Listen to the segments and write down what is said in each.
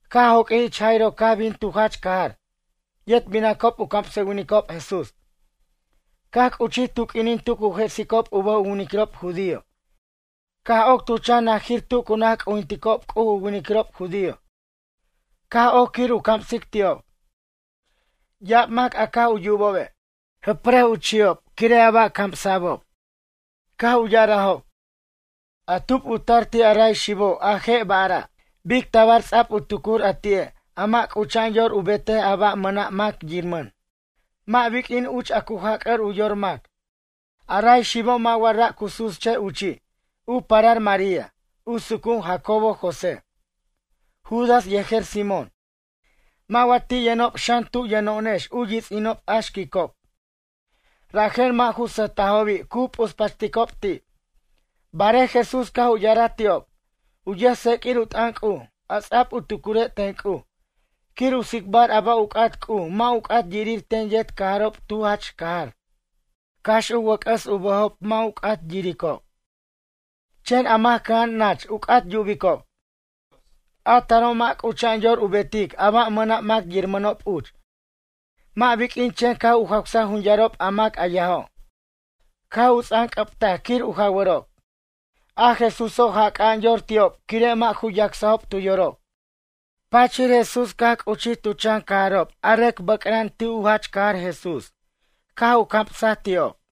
Caj joq'uij ich Jairo caj bin tu jach cajar. Yet binacob u camsʌwinicob Jesús. Caj c'uchij tu q'uinin tu cu jesicob u bʌj u winiquirob judío caj oc tu chan najir tu cu naj c'ujinticob C'uj u winiquirob judío caj oc quir u camsic ti'ob. Ya'ab mac a caj u yubobe', jʌprʌj u chi'ob quire' a ba' camsa'bob. Caj u ya'arajob: ―A tub u tar ti' a ray xibo' a je' ba'ra'? Bic tabar ts'a'b u tucur a ti'e' a mʌ' c'ucha'an yor u betaj a ba' a mʌna' mac yiramʌn, mʌ' biq'uin uch a cu jac'ar u yor mac. A ray xibo' mʌ' wa ra' cu susche' uchi', u parar María, u sucu'un Jacobo José, Judas yejer Simón? Mʌ' wa ti' yʌnʌnob xan tu yʌno'onex u yits'inob a xquicob? Rajen mʌ' ju sʌjtajobi' cu p'uspachticob ti'. Barej Jesús caj u ya'araj ti'ob: ―U yʌjtseq'uir u t'ʌn C'uj, a ts'a'b u tucure' ten C'uj quir u tsicbar a ba' u c'at C'uj mʌ' u c'at yirir ten yet cajarob tu jach cajar. Cax u wʌc'ʌs u bʌjob mʌ' u c'at yiricob. Chen a mac cʌja'an nach u c'at yubicob. A taro' mʌ' c'ucha'an yor u betic a ba' mʌna' mac yiramʌnob uch mʌ' biq'uin chen caj u jawsaj jun yarob a mac a yajo'. Caj u ts'anc'ʌbtaj quir u jawarob. A Jesuso' jac'a'an yor ti'ob quire' mʌ' ju yacsajob tu yorob. Pachir Jesús caj c'uchij tu chan cajarob a rʌc bʌca'an ti' u jach cajar Jesús, caj u camsaj ti'ob.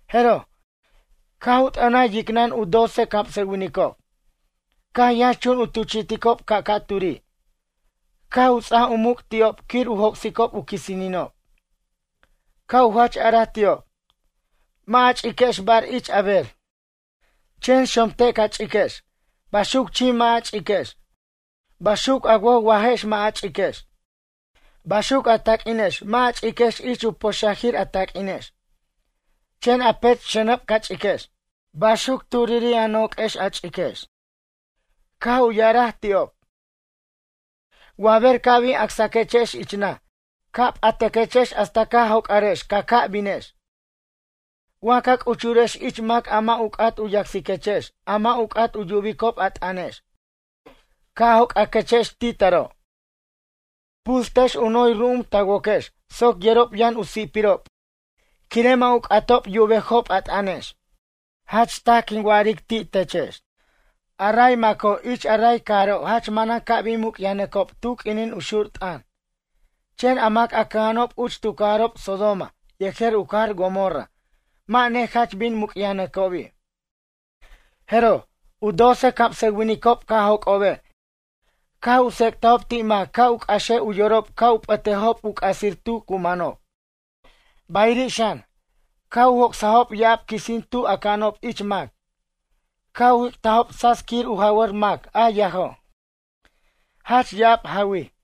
Jeroj, caj t'ʌnaj yicnʌn u doce camsʌwinicob, caj yʌnxchun u tuchi'ticob ca'ca'turi', caj u ts'ajaj u muc' ti'ob quir u joc'sicob u quisininob. Caj u jach araj ti'ob: ―Mʌ' a ch'iquex bar ich a ber. Chen xomte' ca ch'iquex, baxuc chim mʌ' a ch'iquex. Baxuc a woj wajex mʌ' a ch'iquex, baxuc a taq'uinex mʌ' a ch'iquex ich u poxajir a taq'uinex. Chen a pech' xʌnʌb ca ch'iquex, baxuc turiri' a noq'uex a ch'iquex. Caj u ya'araj ti'ob: ―Wa ber ca' bin acsaquechex ich naj ca' p'ataquechex hasta ca joc'arex ca ca' binex. Wa ca c'uchurex ich mac a mʌ' u c'at u yacsiquechex a mʌ' u c'at u yubicob a t'ʌnex, ca' joc'aquechex ti' taro'. Puxtex u noy ru'um ta woquex soc yerob yʌn u si'pirob quire' mʌ' u c'atob yubejob a t'ʌnex. Jach taj quin wa'aric ti' techex, a ray maco' ich a ray cajaro' jach manan ca' bin muc'yajnʌcob tu q'uinin u xur t'ʌn, chen a mac a cʌja'anob uch tu cajarjob Sodoma yejer u cajar Gomorra mʌ' nejach bin muc'yajnʌcobi'. Jeroj, u doce camsʌwinicob caj joc'obe' caj u tsec'tajob ti' mac ca' u c'axej u yorob ca' u p'ʌtejob u c'asir tu cu manob. Bayiri' xan, caj u joc'sajob ya'ab quisin tu aca'anob ich mac, caj u jic'tajob tsats quir u jawʌr mac a yajo', jach ya'ab jawij.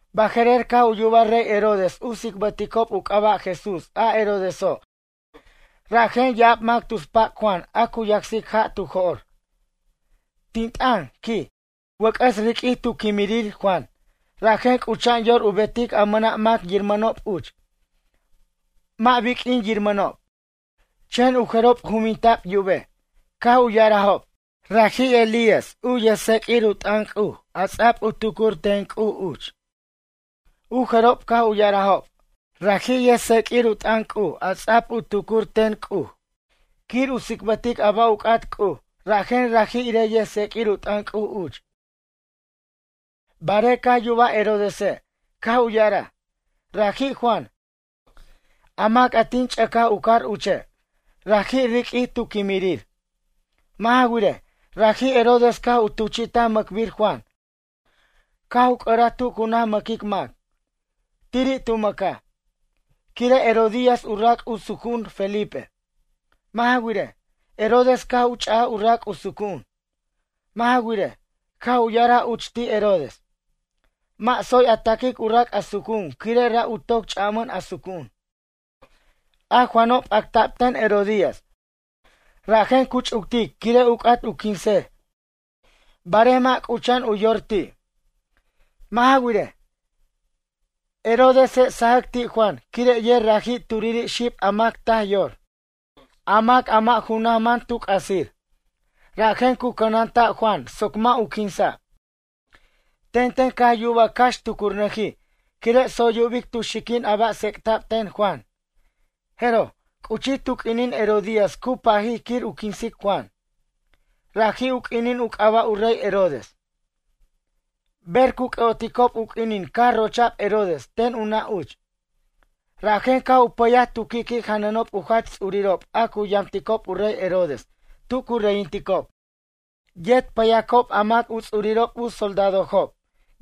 Baje'rer caj u yubaj rey Herodes u tsicbʌticob u c'aba' Jesús a Herodeso' rajen ya'ab mac tus pac' Juan a cu yacsic ja' tu jo'r: ―Tin t'ʌn ―quij―, wʌc'ʌs riq'uij tu quimirir Juan rajen c'ucha'an yor u betic a mʌna' mac yirmʌnob uch, mʌ' biq'uin yirmʌnob. Chen u jerob juninta'b yubej, caj u ya'arajob: ―Raji' Elías u yʌjtseq'uir u t'ʌn C'uj a ts'a'b u tucuric ten C'uj uch. U jerob caj u ya'arajob: ―Raji' yʌjtseq'uir u t'ʌn C'uj a ts'a'b u tucuric ten C'uj quir u tsicbʌtic a ba' u c'at C'uj rajen raji' irej yʌjtseq'uir u t'ʌn C'uj uch. Barej caj yubaj Herodese', caj u ya'araj: ―Raji' Juan, a mac a tin ch'ʌcaj u car uche', raji' riq'uij tu quimirir. Mʌ' ja wirej, raji' Herodes caj u tuchi'taj mʌcbir Juan caj u c'ʌraj tu cu naj mʌquic mac. Tiri' tu mʌcaj, quire' Herodías u rac' u sucu'un Felipe. Mʌ' ja wirej, Herodes caj u ch'aj u rac' u sucu'un. Mʌ' ja wirej, caj u ya'araj uch ti' Herodes: ―Mʌ' tsoy a taquic u rac' a sucu'un quire' ra' u toc ch'amʌn a sucu'un. A Juano' p'acta'b ten Herodías rajen cu ch'uctic quire' u c'at u quinsej barej mʌ' c'ucha'an u yor ti'. Mʌ' ja wirej, Herodese' sajʌc ti' Juan quire' yer raji' turiri' xib a mac taj yor, a mac a mʌ' u naj man tu c'asir, rajen cu cʌnanta' Juan soc mʌ' u quinsa'. Tenten caj yubaj cax tucurnʌjij quire' tsoy yubic tu xiquin a ba' tsec'ta'b ten Juan. Jeroj, c'uchij tu q'uinin Herodías cu pajic quir u quinsic Juan. Raji' u q'uinin u c'aba' u rey Herodes, ber cu c'ʌ'oticob u q'uinin caj rocha'b Herodes ten u nʌ' uch. Rajen caj u pʌyaj tu qui'qui' janʌnob u jach ts'urirob a cu yamticob u rey Herodes tu cu reyinticob. Yet payacob a mac u ts'urirob u soldadojob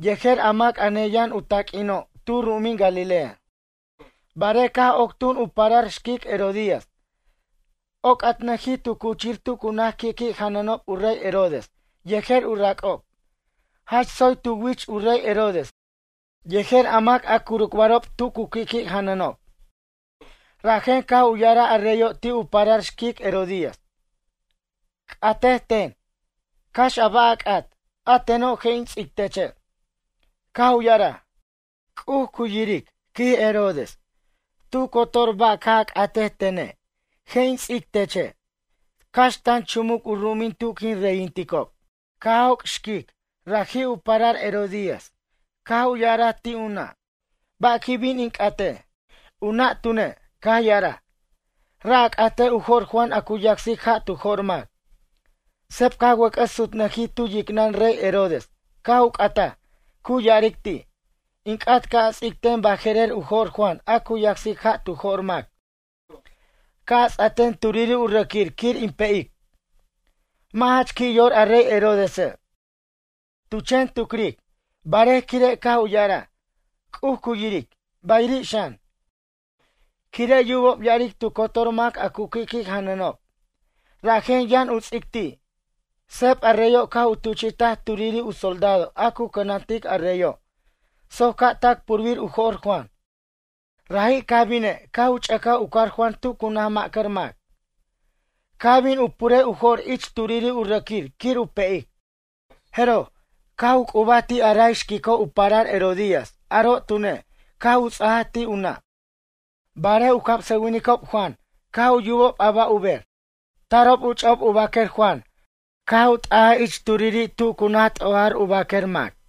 yejer a mac a neyʌn u taq'uino' tu ru'umin Galilea. Barej caj oc tun u parar xquic Herodías, oc'atnʌjij tu cuchir tu cu naj qui'qui' janʌnob u rey Herodes yejer u rac'ob. Jach tsoy tu wich u rey Herodes yejer a mac a curucbarob tu cu qui'qui' janʌnob. Rajen caj u ya'araj a reyo' ti' u parar xquic Herodías: ―C'atej ten, cax a ba' a c'at, a teno' je' in ts'ic teche'. Caj u ya'araj: ―C'uj cu yiric ―quij Herodes―. Tu cotor ba' ca' a c'atej tene' je' in ts'ic teche' tac tan chumuc u ru'umin tu quin reyinticob. Caj joc' raji' u xquic u parar Herodías, caj u ya'araj ti' u nʌ': ―Ba' quin bin in c'atej? U nʌ' tune', caj ya'araj: ―Ra' a catej u jo'r Juan a cu yacsic ja' tu jo'r mac. Seb caj wʌc'ʌs sutnʌjij tu yicnʌn rey Herodes caj u c'ataj, cu ya'aric ti': ―In c'at ca' a ts'ic ten baje'rer u jo'r Juan a cu yacsic ja' tu jo'r mac, ca' a ts'a ten turiri' u rʌquir quir in pe'ic. Mʌ' jach qui' yor a rey Herodese', tu chen tucric, barej quire' caj u ya'araj: “C'uj cu yiric”, bayiri' xan, quire' yubob ya'aric tu cotor mac a cu qui'qui' janʌnob rajen yʌn u ts'ic ti'. Seb a reyo' caj u tuchi'taj turiri' u soldado a cu cʌnantic a reyo' soc ca' tac purbir u jo'r Juan. Raji' caj bine' caj u ch'ʌcaj u car Juan tu cu naj macar mac, caj bin u purej u jo'r ich turiri' u rʌquir quir u pe'ic. Jeroj, caj u c'ubaj ti' a ray xquico' u parar Herodías aro' tune' caj u ts'ajaj ti' u nʌ'. Barej u camsʌwinicob Juan caj u yubob a ba' u ber, tarob u ch'a'ob u baquer Juan caj u t'ajaj ich turiri' tu cu naj t'ojar u baquer mac.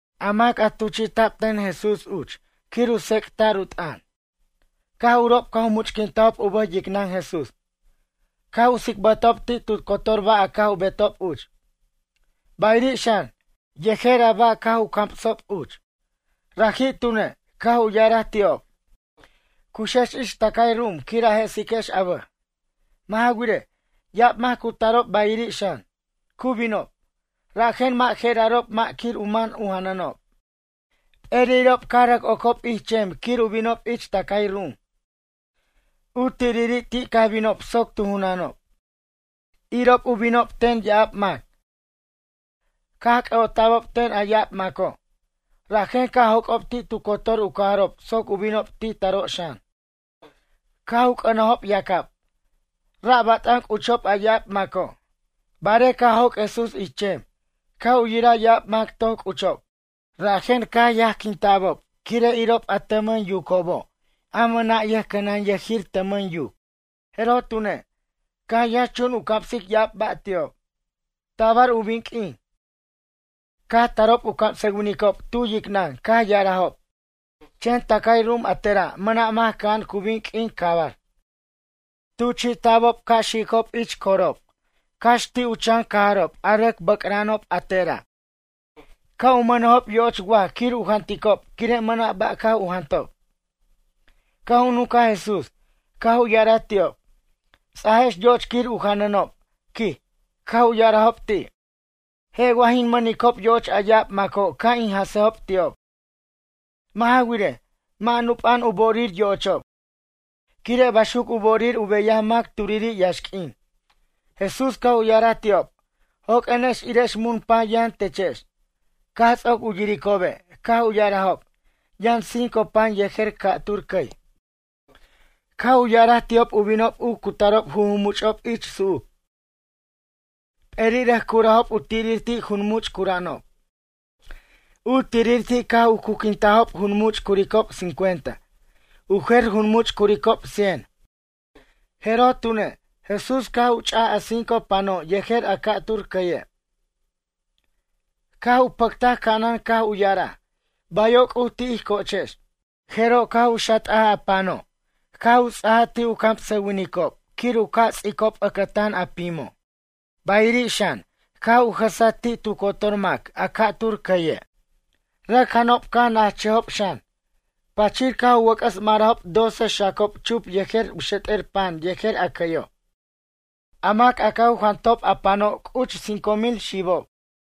A mac a tuchi'ta'b ten Jesús uch quir u tsec'ta'r u t'ʌn, caj urob caj u much'quintajob u bʌj yicnʌn Jesús, caj u tsicbʌtajob ti' tu cotor ba' a caj u betob uch, bayiri' xan, yejer a ba' caj u camsob uch. Raji' tune', caj u ya'araj ti'ob: ―Cuxex ich tʌcay ru'um quir a je'siquex a bʌj. Mʌ' ja wirej, ya'ab mac cu tarob bayiri' xan, cu binob, rajen mʌ' je'erarob mʌ' quir u man u janʌnob. P'eri'ob caj rʌc ocob ich chem quir u binob ich tʌcay ru'um. U tiriri' ti' caj binob soc tu junʌnob. Irob u binob ten ya'ab mac, caj c'ʌ'ota'bob ten a ya'ab maco'. Rajen caj joc'ob ti' tu cotor u cajarob soc u binob ti' taro' xan, caj u c'ʌnajob yacab. Ra' bat'an c'uchob a ya'ab maco'. Barej caj joc' Jesús ich chem, caj u yiraj ya'ab mac toc c'uchob, rajen caj yajquinta'bob quire' irob a tʌmʌn yucobo' a mʌna' yʌjcʌnanyʌjir tʌmʌn yuc. Jeroj tune', caj yʌnxchun u camsic ya'ab ba' ti'ob. Tabar u bin q'uin, caj tarob u camsʌwinicob tu yicnʌn caj ya'arajob: ―Chen tʌcay ru'um a tera' mʌna' mac cʌja'an cu bin q'uin cabar. Tuchi'tabo' ca' xicob ti' corob, cax ti' u chan cajarob a rʌc bʌca'anob a tera', ca' u mʌnejob yo'och waj quir u janʌnticob quire' mʌna' ba' caj u jantob. Caj u nuncaj Jesús, caj u ya'araj ti'ob: ―Ts'ajex yo'och quir u janʌnob ―quij. Caj u ya'arajob ti': ―Je' wa jin mʌnicob yo'och a ya'ab maco' ca' in jʌsejob ti'ob. Mʌ' ja wirej, mʌ' nupa'an u bo'orir yo'ochob, quire' baxuc u bo'orir u beyaj mac turiri' yaxq'uin. Jesús caj u ya'araj ti'ob: ―Joq'uenex irex mun pan yʌn techex. Caj ts'oc u yiricobe', caj u ya'arajob: ―Yʌn cinco pan yejer ca'tur cʌy. Caj u ya'araj ti'ob u binob u cutarob jujumuch'ob ich su'uc. P'eri' rʌc curajob u tirir ti' junmuch' cura'anob. U tirir ti' caj u cuquintajob junmuch' curicob cincuenta. U jer junmuch' curicob cien. Jeroj tune', Jesús caj u ch'aj a cinco pano' yejer a ca'tur cʌye', caj u pʌctaj ca'anan caj u ya'araj: “Bayo' C'uj ti' ij co'ochex.” Jeroj caj u xat'aj a pano' caj u ts'aj ti' u camsʌwinicob quir u ca' ts'a'icob ʌcʌtan a pimo'. Bayiri' xan, caj u jʌsaj ti' tu cotor mac a ca'tur cʌye'. Rʌc janob caj najchʌjob xan. Pachir caj u wʌc'ʌs marajob doce xacob chup yejer u xet'er pan yejer a cʌyo'. A mac a caj u jantob a pano' cuch cinco mil xibob.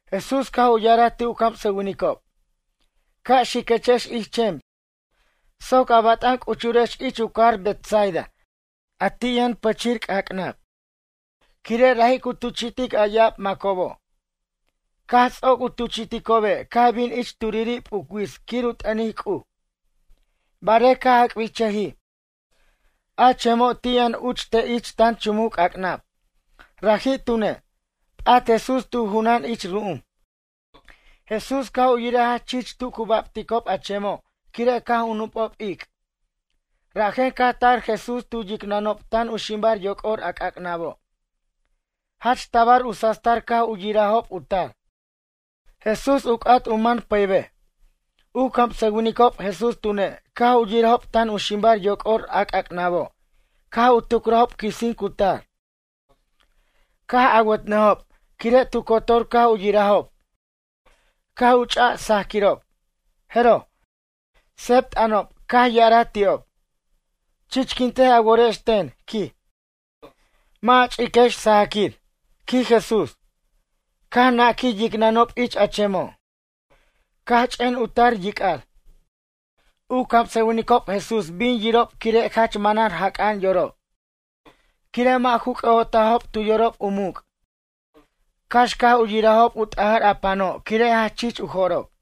Jesús caj u ya'araj ti' u camsʌwinicob: ―Ca' xiquechex ich chem soc a bat'an c'uchurex ich u cajar Betsaida a ti' yʌn pichir c'ac'nab. Quire' raji' cu tuchi'tic a ya'ab macobo'. Caj ts'oc u tuchi'ticobe' caj bin ich turiri' p'uc wits quir u t'ʌnic C'uj. Barej caj ac'birchʌjij, a chemo' ti' yʌn uch te' ich tan chumuc c'ac'nab. Raji' tune', p'at Jesús tu junan ich ru'um. Jesús caj u yiraj jach chich tu cu babticob a chemo' quire' caj u nup'ob ic', rajen caj tar Jesús tu yicnʌnob tan u ximbar yoc'or a c'ac'nabo'. Jach tabar u sastar caj u yirajob u tar. Jesús u c'at u man pʌybej. U camsʌwinicob Jesús tune', caj u yirajob tan u ximbar yoc'or a c'ac'nabo' caj u tucrajob quisin cu tar, caj awʌtʌjob. Quire' tu cotor caj u yirajob, caj u ch'aj saquirob, jeroj, seb t'ʌnob, caj ya'araj ti'ob: ―Chichquintej a worex ten ―quij―, mʌ' a ch'iquex sajaquir ―quij Jesús. Caj naquij yicnʌnob ich a chemo', caj ch'en u tar yic'ar. U camsʌwincob Jesús bin yorob quire' jach manan jac'a'an yorob. Quire' mʌ' ju c'ʌ'otajob tu yorob u muc', cax caj u yirajob u t'ajʌr a pano' quire' jach chich u jo'rob.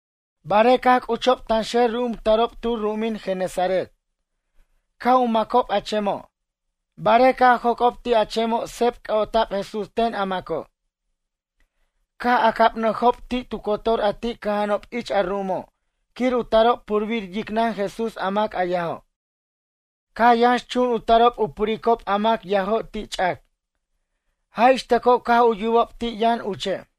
Barej caj c'uchob tanxer ru'um tarob tu ru'umin Genesaret, caj u macob a chemo'. Barej caj joc'ob ti' a chemo' seb c'ʌ'ota'b Jesús ten a maco'. Caj acabnʌjob ti' tu cotor a ti' cʌja'anob ich a ru'umo' quir u tarob purbir yicnʌn Jesús a mac a yajo'. Caj yʌnxchun u tarob u puricob a mac yajo' ti' ch'ac, jaj ix tʌco caj u yubob ti' yʌn uche'.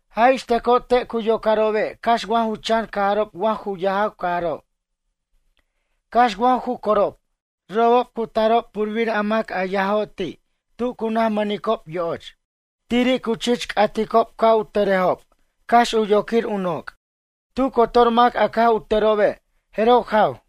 Jaj ix tʌco te' cu yocarobe' cax wa ju chan cajarob wa ju yajaw cajarob, cax wa ju corob, robob cu tarob purbir mac a yajo' ti' tu cu naj mʌnicob yo'och, tiri' cu chich c'aticob ca' u tʌrejob cax u yoquir u noc'. Tu cotor mac a caj u tʌrobe', jeroj jaw.